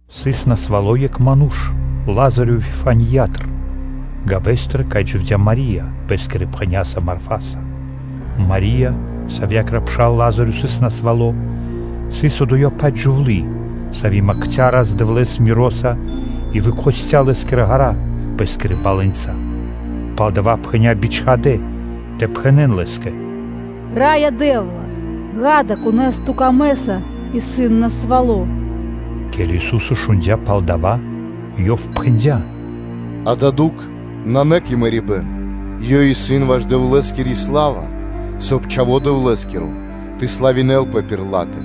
Сыс насвало́ екх ману́ш Лазарё Вифаниятыр, гавэстыр, кай дживдя́ Мари́я пэ́скирэ пхэняса Марфаса. Мари́я, савьякиро пшал Лазарё сыс насвало́, сыс одоя-паць джувлы́, сави́ макця Рас-Дэвлэ́с миро́са и выкхосця Лэ́скирэ ґэра́ пэ́скирэ балэнца. Палдова́ пхэня́ бичхадэ́ тэ пхэнэ́н Лэ́скэ: “Раё Дэ́вла! Ѓа́да, кон исын дро́го Ту́кэ, исын насвало́” Ке́ли Ису́со шундя́ пал дава́, Ёв пхэндя́: “Дая́ дукх исын на кэ мэрибэ́н, ёй исын ваш Дэвлэ́скири сла́ва, соб (кай) Чхаво́ Дэвлэ́скиро тэ славинэлпэ пир ла́тэ.”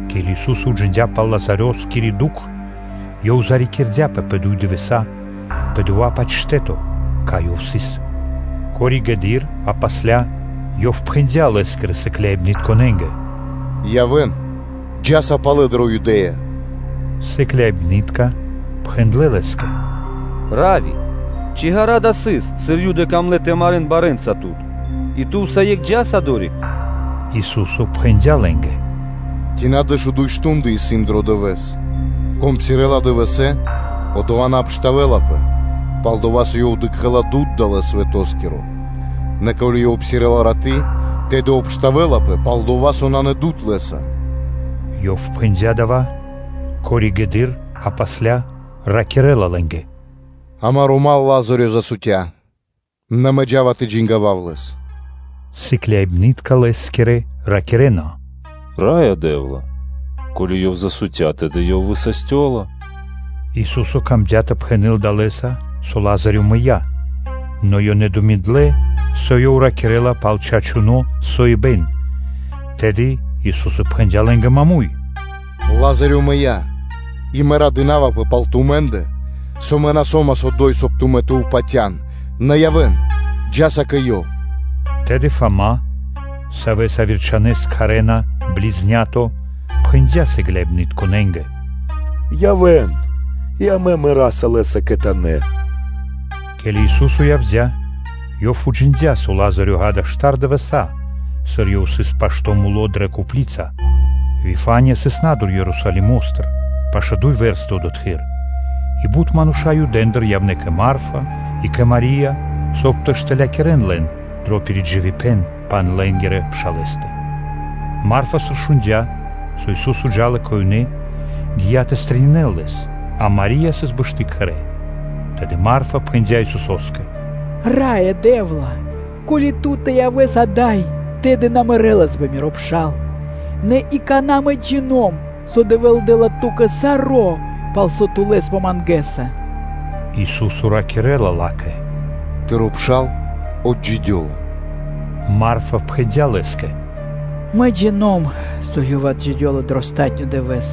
Ке́ли Ису́со уджиндя́ пал Лазарёскири дукх, Ёв зарикирдяпэ пэ дуй дывэса́ пэ дова́-паць штэ́то, кай Ёв сыс. Коригэды́р (позжэды́р) Ёв пхэндя́ Лэ́скирэ сыкляибнытконэ́нгэ: “Явэ́н, джа́са палэ дрэ Юдэ́я.” Сыкляибны́тка пхэндлэ́ Лэ́скэ: “Равви! Ци ґара́ дава́ сыс, сыр Юды камлэ́ тэ марэ́н барэ́нца Тут, и Ту усае́кх джа́са одори́к?” Ису́со пхэндя́ лэ́нгэ: “Ци на дэшуду́й мардэ́ (штунды) исын дро дывэ́с? Кон псирэ́ла дывэсэ́, одова́ на обштавэлапэ, пал-дова́ со ёв дыкхэ́ла дуд далэ́ свэтоскиро; нэ ко́ли ёв псирэ́ла раты́, тэды обштавэлапэ, пал-дова́ со нанэ дуд лэ́са.” Ёв пхэндя́ дава́, и коригэды́р (позжэды́р) ишчо (инкэ́) ракирэ́ла лэ́нгэ: “Амаро́ дру́го (мал) Лазарё засутя, нэ Мэ джа́ва тэ джангавав лэс.” Сыкляибны́тка Лэ́скирэ ракирэ́на: “Раё Дэ́вла! Ко́ли ёв засутя, тэды ёв высастёла.” Ису́со камдя́ тэ пхэнэ́л далэ́са, со Лазарё мыя́; нэ ёнэ думиндлэ, со Ёв ракирэ́ла пал чачуно́ соибэн.” Тэды Ису́со пхэндя́ лэ́нгэ маму́й: “Лазарё мыя́. И Мэ радынавапэ пал тумэ́ндэ, со Мэ на со́мас одо́й, соб (кай) тумэ́ тэ упатян. Нэ явэ́н, джа́са кэ ёв.” Тэды Фама, Савэс пэ яви́р кхарэ́на ‘Близнято,’ пхэндя́ сыкляибнытконэ́нгэ: “Явэ́н и амэ мэраса лэ́са кхэтанэ́.” Ке́ли Ису́со явдя́, Ёв уджиндя́, со Лазарё, ґа́да, штар дывэса́, сыр ёв исын пашто́ муло́ дрэ копли́ца. Вифания сыс на́дур Ерусалимо́стыр, пашэ́ дуй вэрсты одотхы́р, и бут мануша́ Юдэндыр явнэ́ кэ Марфа и кэ Мари́я, соб (кай) тэ штылякирэн лэн дро пиридживибэн пал лэ́нгирэ пшалэ́стэ. Марфа, сыр шундя́, со Ису́со джа́ла кэ ёнэ, гия́ тэ стрэнинэл Лэс; а Мари́я сыс бэшты кхэрэ́. Тэды Марфа пхэндя́ Исусо́скэ: “Раё Дэ́вла! Ко́ли Ту тэ явэс ада́й, тэды на мэрэлас бы миро пшал; Нэ и какана́, мэ джино́м (джина́в), со Дэвэ́л дэ́ла Ту́кэ саро́, пал со Ту Лэс помангэса.” Ису́со ракирэ́ла ла́кэ: “Тыро́ пшал отджидёла.” Марфа пхэндя́ Лэ́скэ: “Мэ джино́м (джина́в), со ёв отджидёла дро палатуно́ (последнё) дывэ́с.”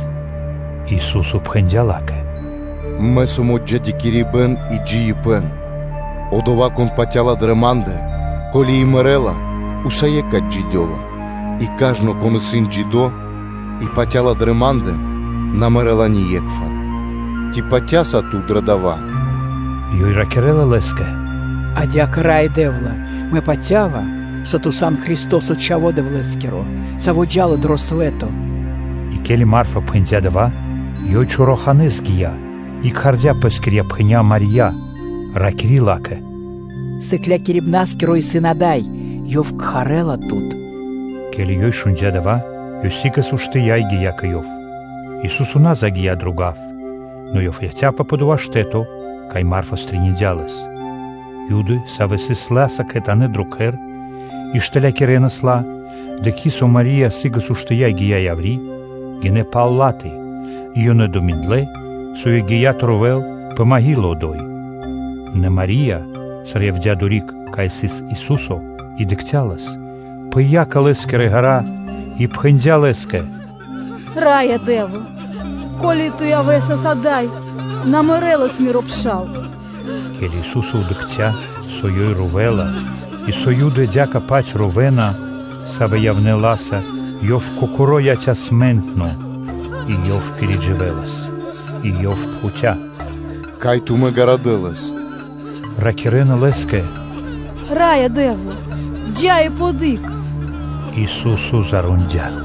Ису́со пхэндя́ ла́кэ: “Мэ сом отджидякирибэн и джиибэ́н; одова́, кон патя́ла дрэ Ма́ндэ, ко́ли и мэрэ́ла, усае́кх отджидёла; И кажно, кон исын джидо́ и патя́ла дрэ Ма́ндэ, на мэрэ́ла ние́кхвар. Ци патя́са ту дро дава́?” Ёй ракирэ́ла Лэ́скэ: “Адя́кэ, Раё Дэ́вла! Мэ патя́ва, со Ту сан Христо́со, Чхаво́ Дэвлэ́скиро, саво́ джа́ла дро свэ́то.” И ке́ли Марфа пхэндя́ дава́, ёй чораханэ́с гия́ и кхардя́ пэскирья́ пхэня́ Мари́я, ракири́ ла́кэ: “Сыклякирибна́скиро исын ада́й, Ёв кхарэ́ла тут.” Ке́ли ёй шундя́ дава́, ёй сы́гэс уштыя́ и гия́ кэ Ёв. Ису́со на загия́ дро гав, нэ Ёв яця́пэ пэ дова́ штэ́то, кай Марфа стрэниндя (пирилыя) Лэс. Юды, савэ́ сыс ла́са кхэтанэ́ дро кхэр и штылякирэнас ла, дыкхи́, со Мари́я сы́гэс уштыя́ и гия́ яври́, гинэ́ пал ла́тэ, и ёнэ думиндлэ, со ёй гия́ тэ ровэл пэ маґила одо́й. Нэ Мари́я, сыр явдя́ одори́к, кай сыс Ису́со, и дыкхця́ Лэс, пыя́ кэ Лэ́скирэ ґэра́ и пхэндя́ Лэ́скэ: “Раё Дэ́вла! Ко́ли Ту явэсас ада́й, на мэрэлас миро пшал.” Ке́ли Ису́со дыкхця́, со ёй ровэла и, со Юды адя́кэ-паць ровэна, савэ́ явнэ́ ла́са, Ёв Кокоро́ пыя́ дро ду́хо и Ёв пиридживэлас. И Ёв пхуця́: “Кай тумэ́ гарадэ́ лэс?” Ракирэ́на Лэ́скэ: “Раё Дэ́вла! Джа́ и дыкх адари́к.” Ису́со зарондя.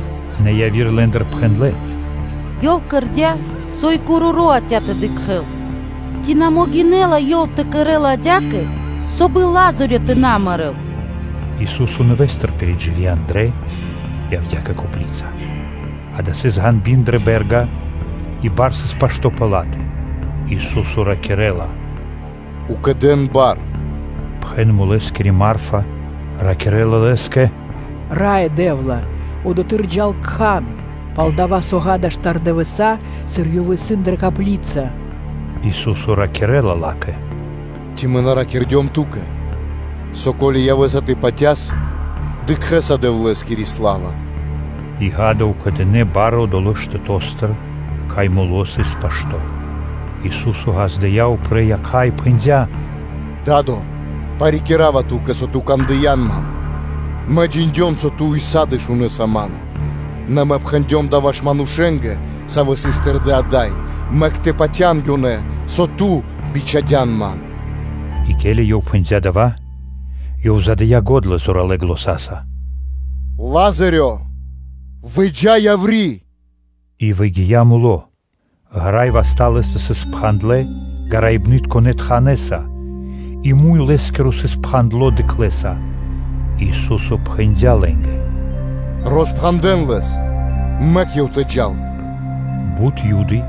Нэ яви́р лэ́ндыр пхэндлэ́: “Ёв кэрдя́, со и короро́ яця́ тэ дыкхэ́л, ци на могинэ́ла ёв тэ кэрэ́л адя́кэ, соб (кай) и Лазарё тэ на мэрэ́л?” Ису́со, нэвэ́стыр пиридживи андра́л, явдя́ кэ копли́ца. Дава́ сыс ґеба́р (пешчэра) дрэ бэ́рга, и бар сыс пашто́ пэ ла́тэ. Ису́со ракирэ́ла: “Укэдэн бар.” Пхэн мулэскири, Марфа, ракирэ́ла Лэ́скэ: “Раё Дэ́вла! Одотхы́р джа́ла кхан; пал-дова́ со, ґа́да, штар дывэса́, сыр ёв исын дрэ копли́ца.” Ису́со ракирэ́ла ла́кэ: “Ци Мэ на ракирдём ту́кэ, со ко́ли явэ́са тэ патяс, дыкхэ́са Дэвлэ́скири сла́ва?” И, ґа́да, укэдынэ бар одолэ́ штэто́стыр, кай муло́ сыс пашто́. Ису́со ґаздыя́ упрэ́ якха́ и пхэндя́: “Да́до! Парикирава Ту́кэ, со Ту кандыян Ман; Мэ джиндём, со Ту ўса́ды (сак) шунэса Ман; нэ Мэ пхэндём дава́ ваш манушэ́нгэ, савэ́ сыс тэрдэ́ ада́й, мэк тэ патя́н ёнэ, со Ту бичхадян Ман.” И ке́ли Ёв пхэндя́ дава́, Ёв дыя́ го́дла зоралэ́ заня́са: “Лазаре! Выджа яври́.” И выгия́ муло́, ґэра́ и васта́ лэ́стэ сыс спхандлэ гараибнытконэ тханэса, и муй лэ́скиро сыс пхандло дыхлэса. Ису́со пхэндя́ лэ́нгэ: “Роспхандэн лэс, мэк ёв тэ джал.” Бут Юды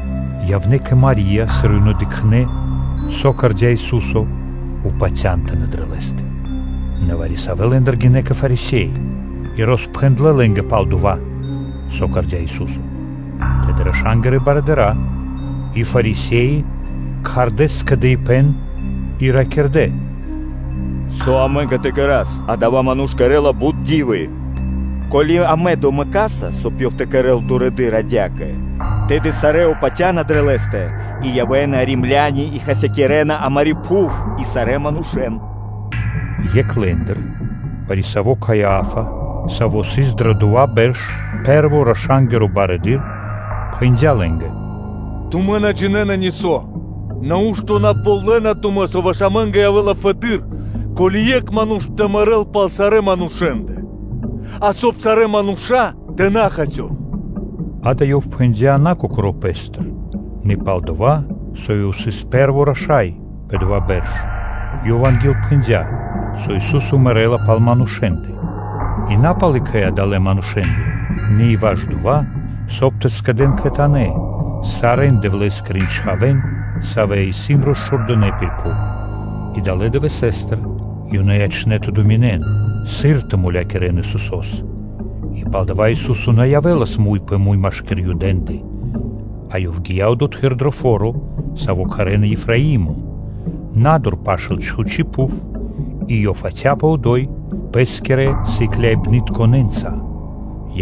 явнэ́ кэ Мари́я, сыр ёнэ дыкхнэ́, со кэрдя́ Ису́со, патяндынэ́ дрэ Лэ́стэ; Нэ вари-савэ́ лэ́ндыр гинэ́ кэ Фарисе́и, и роспхэндлэ́ лэ́нгэ пал дова́, со кэрдя́ Ису́со. Тэды раша́нгирэ барыдыра́ и Фарисе́и кхардэ́ скэдыибэ́н и ракирдэ́: “Со амэ́нгэ тэ кэра́с? Адава́ Ману́ш кэрэ́ла бут ди́вы. Ко́ли амэ домэкаса, соб (кай) Ёв тэ кэрэ́л дурэды́р адя́кэ, тэды сарэ́ упатяна дрэ Лэ́стэ, и явэ́на Римляни и хасякирэна амари́ пхув и сарэ́ манушэ́н.” Екх лэ́ндыр, вари-саво́ Каиа́фа, саво́ сыс дрэ дова́ бэрш пэ́рво раша́нгиро барыдыро́, пхэндя́ лэ́нгэ: “Тумэ́ на джинэ́на нисо́. Нау́што на ґалёна тумэ́, со ваш амэ́нгэ явэ́ла фэды́р, ко́ли екх ману́ш тэ мэрэ́л пал сарэ́ манушэ́ндэ, а соб (кай) сарэ́ мануша́ тэ на хасён.” Дава́ ёв пхэндя́ на кокоро́ пэ́стыр, нэ пал-дова́ со ёв сыс пэ́рво раша́й пэ дова́ бэрш, ёв ангилпхэндя, со Ису́со мэрэ́ла пал манушэ́ндэ, И на пал екхэ адалэ́ манушэ́ндэ, нэ и ваш дова́, соб (кай) тэ скэдэ́н кхэтанэ́ сарэ́н Дэвлэскирэн чхавэ́н, савэ́ исын росчхурдынэ пир пхув. И адалэ́ дывэстыр ёнэ ячнэ́ тэ думинэн, сыр тэ мулякирэ́н Исусо́с. И палдава́ Ису́со на явэ́лас муй пэ муй машки́р Юдэ́ндэ, а Ёв гия́ одотхы́р дро фо́ро, саво́ кхарэ́на Ефраимо, на́дур пашы́л чхучи́ пхув, и Ёв яця́пэ одо́й Пэ́скирэ сыкляибнытконэ́нца.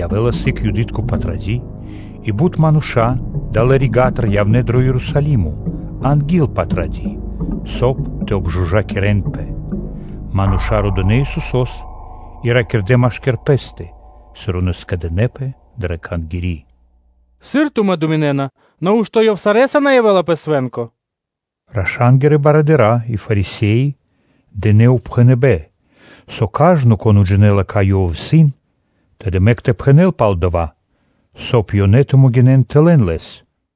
Явэ́лас сыг Юды́тко Патради́, и бут мануша́ адалэ́ рига́тыр явнэ́ дро Ерусалимо анги́л Патради́, соб (кай) тэ обжужакирэнпэ (тэ обчыстинэнпэ). Мануша́ родынэ Исусо́с и ракирдэ́ машки́р пэ́стэ, сыр ёнэ скэдынэ́пэ дрэ Кхангири́: “Сыр тумэ́ думинэ́на? Нау́што Ёв сарэ́са на явэ́ла пэ свэ́нко?” Раша́нгирэ барыдыра́ и Фарисе́и дынэ́ упхэныбэ́н, со кажно, кон уджинэла, кай Ёв исын, тэды мэк тэ пхэнэ́л пал дава́, соб (кай) Ёнэ тэ могинэн тэ лэн Лэс.